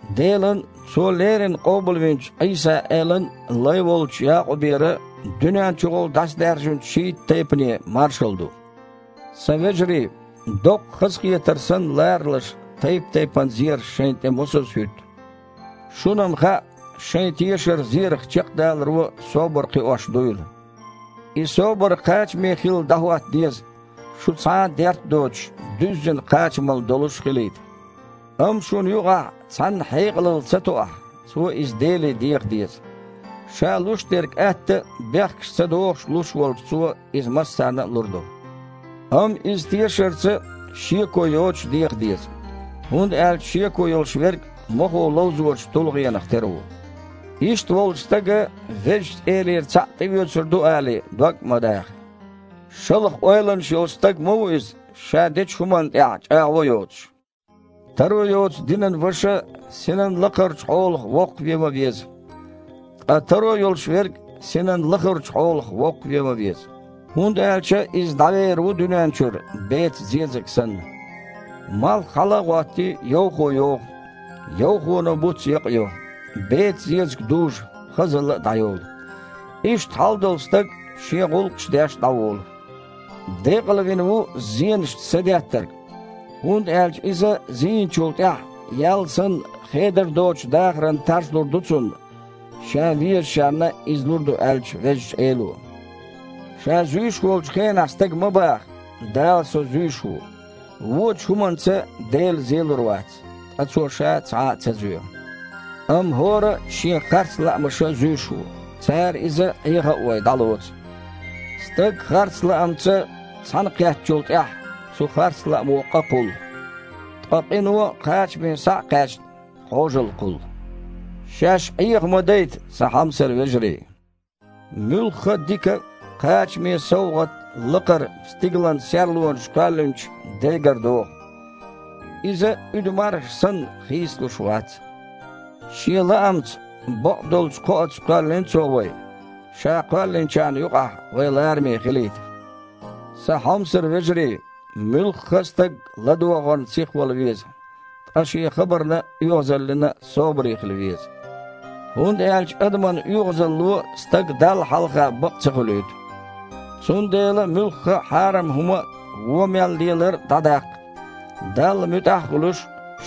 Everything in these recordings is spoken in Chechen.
Делан а, Цо леррина къобалвинчу Іийса-Элан а лай волчу Якъубера дуьнен чухула дІасадаьржинчу шийтта тайпане маршалла ду. Сан вежарий, доккха хазахетар санна ларалаш тайп-тайпана зераш шайна тІе мосазза хІуьтту. Шуна-м хаьа шайн тешар зерах чекхдаларо собар кхиош дуйла. И собар кхачаме хилла дІахІотта деза, шу, цхьа а дерт а доцуш, дуьззина кхачамалла долуш хилийта. Амма шуна юкъахь цхьанна хьекъалалла ца тоахь, цо иза Деле деха деза. Ша луш дерг атта а, бехкаш ца дохуш а луш волчу Цо иза массарна а лур ду. Амма иза тешарца а, шеко йоцуш а деха деза, хІунда аьлча шеко йолуш верг мохо ловзочу тулгІенах тера ву. Иштта волчу стага, Везачу Элера цхьаъ тІеоьцур ду алий, дог а ма даха. Шалха ойланаш йолу стаг ма ву иза, ша дечу хІуманна тІехь чІагІо а йоцуш. Таро йоцу динан ваша синан лакхарчу хьолах воккхавеван веза, ткъа таро йолуш верг синан лахарчу хьолах воккхавеван веза, хІунда аьлча иза дІавер ву дуьнен чуьра, бецан зезаг санна. Малх хьала а гІоттий, йовхо йогІу. Йовхоно буц якъайо, бецан зезаг дужу, хазалла а дІайолу. Иштта хьалдолу стаг а, шен гІуллакхаш а деш, дІаволу. Декъалвина ву зенашна садеттарг, хІунда аьлча иза зийначул тІаьхьа, ял санна, хедар доцучу дахаран таж лур ду цунна Ша везачарна иза лур ду аьллачу Везачу Эло. Ша зуьйш волчу хенахь стага ма баха: «Дала со зуьйш ву». Вочу хІуманца Дела зелур вац, ткъа Цо Ша цхьа а ца зоь. Амма хІора а шен харц лаамаша зуьйш ву, цара иза, Іеха а вой, дІалоцу. Стаг харц лаамца цхьаьнакхеттачул тІаьхьа, цу харц лаамо къа кхуллу, ткъа къино, кхачаме схьа а кхаьчна, Іожалла кхуллу. Шаьш Іеха ма дайта, сан хьомсара вежарий. Муьлхха а дика а, кхачаме а совгІат лакхара, стигалан серлонаш кхоьллинчу Дегара догІу. Иза, уьду мархаш санна, хийцалуш вац. Шен лаамца, бакъдолчу кхоаца кхоьллина Цо вай, Ша кхоьллинчарна юкъахь вай лараме хилийта. Сан хьомсара вежарий, муьлхха а стаг ладогІарна сихвала веза, ткъа шен хабарна а, оьгІазаллина а собаре хила веза, хІунда аьлча адаман оьгІазалло стаг Далла хьалха бакъ ца хуьлуьйту. Цундела муьлхха а хьарам хІума а, вон мел лелар а дІадаккха. Далла муьтІахь а хуьлуш,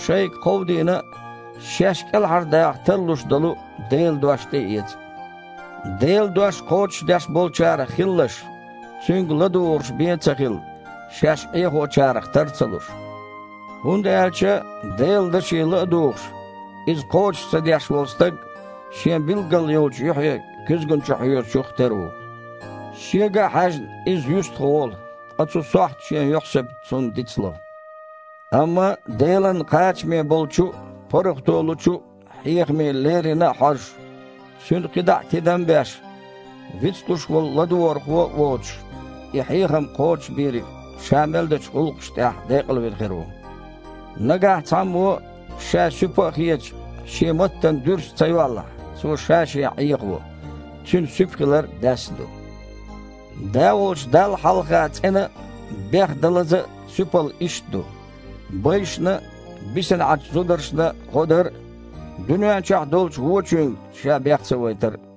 шайга кховдийна а, шаьш кІелхьардаха тарлуш долу а Делан дош тІеэца. Делан дош кхочушдеш болчарах хилалаш, цуьнга ладугІурш бен а ца хилла, шаьш Іехочарах тар а ца луш. ХІунда аьлча, Делан даше ла а дугІуш, иза кхочуш ца деш волу стаг шен билггал йолчу юьхье куьзгана чу хьоьжучух тера ву. Шега а хьаьжна, иза юьстахволу, ткъа цу сохьта шен юьхьсибат цунна дицло. Амма Делан кхачаме болчу а, паргІато лучу а хьехаме леррина а хьожуш, цуьнан кхидІа а тидам а беш, вицлуш волу ладогІархо а воцуш, и хьехам кхочушбийриг ша мел дечу гІуллакхашна тІехь декъалвина хир ву. Нагахь цхьаммо, ша суьпа а хеташ, шен маттана дуьрста ца йоллахь, цо ша-шен Іехаво, цуьнан суьпа хилар а даьсса ду. Да волчу Далла хьалха цІена а, бехдалаза а суьпалла иштта ду: байшна а, бисина Іачу зударшна а гІо дар а, дуьнен чохь долчу вочуьнга ша бех ца вайтар а.